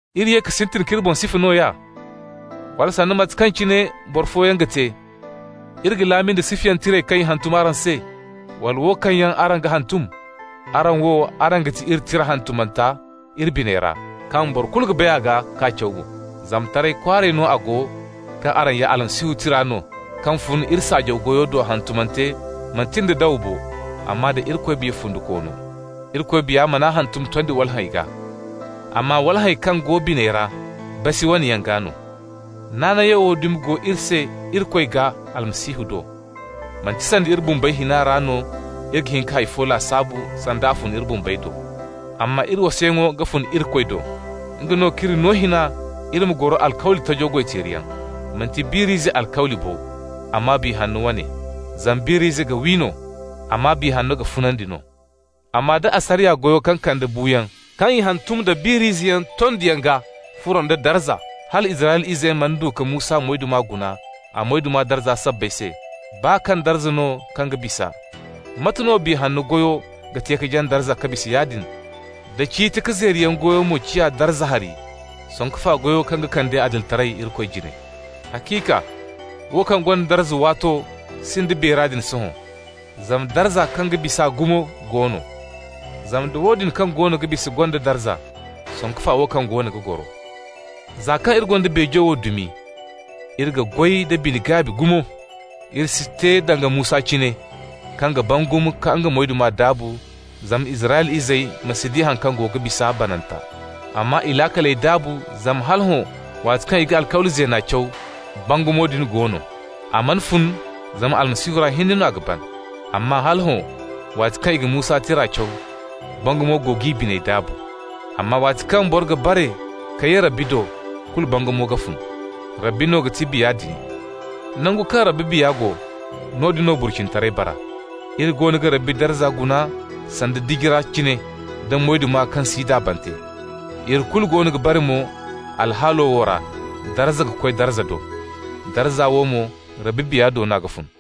Iri ye ka sintin k'iri boŋ sifa nooya? Wala, sanda mate kaŋ cine boro fooyaŋ ga te, iri ga laami nda sifayaŋ tirey kaŋ i ga hantum araŋ se, wala wo kaŋ yaŋ araŋ ga hantum? Araŋ wo, araŋ ga ti iri tira hantumanta iri biney ra, kaŋ boro kulu ga bay a gaa k'a caw mo. Zama taray kwaaray no a go kaŋ araŋ ya Almasihu tira no kaŋ fun iri saajaw goyo do, hantumante manti nda dawa bo, amma da Irikoy Biya fundikoono. Irikoy Biya man'a hantum tondi walhẽy gaa, amma walhẽy kaŋ go biney ra, basi wane yaŋ gaa no. Naanayo wo dumi go iri se Irikoy gaa Almasihu do. Manti sanda iri bumbey hina ra no iri ga hin ka hay fo lasaabu sanda a fun iri bumbey do, amma iri wasayaŋo ga fun Irikoy do. Nga no k'iri no hina iri ma goro alkawli tajo goy-teeriyaŋ. Manti biir'ize alkawli bo, amma Biya Hanno wane. Zama biir'ize ga wi no, amma Biya Hanno ga funandi no. Amma da asariya goyo kaŋ kande buuyaŋ, kaŋ i hantum da biir'izeyaŋ tondiyaŋ gaa furo nda darza, hala Israyla izey mana du ka Musa moyduma guna, a moyduma darza sabbay se (baa kaŋ darza no kaŋ ga bisa), mate no Biya Hanno goyo ga te ka jaŋ darza ka bisa yaadin? Da ciiti-ka-zeeriyaŋ goyo mo ciya darza hari, sanku fa goyo kaŋ ga kande adilitaray Irikoy jine! Haciika, wo kaŋ gonda darza waato sinda beera din sohõ, zama darza kaŋ ga bis'a gumo go no. Zama nda woodin kaŋ goono ga bisa gonda darza, sanku fa wo kaŋ goono ga goro! Za kaŋ iri gonda beejo wo dumi, iri ga goy da bine-gaabi gumo. Iri si te danga Musa cine, kaŋ ga bangum ka nga moyduma daabu zama Israyla izey ma si di haŋ kaŋ go ga bisa bananta. Amma i laakaley daabu, zama hala hõ, waati kaŋ i ga Alkawli Zeena caw, bangumo din go no. A mana fun zama Almasihu ra hinne no a ga ban. Amma hala hõ, waati kaŋ i ga Musa tira caw, bangum go g'i biney daabu. Amma waati kaŋ boro ga bare ka ye Rabbi do, kulu bangumo ga fun. Rabbi no ga ti Biya din. Nangu kaŋ Rabbi Biya go, noodin no burcinitaray bara. Iri goono ga Rabbi darza guna sanda diji ra cine da moyduma kaŋ si daabante. Iri kulu goono ga bare mo alhaalo wo ra, darza ka koy darza do. Darza wo mo Rabbi Biya do no a ga fun.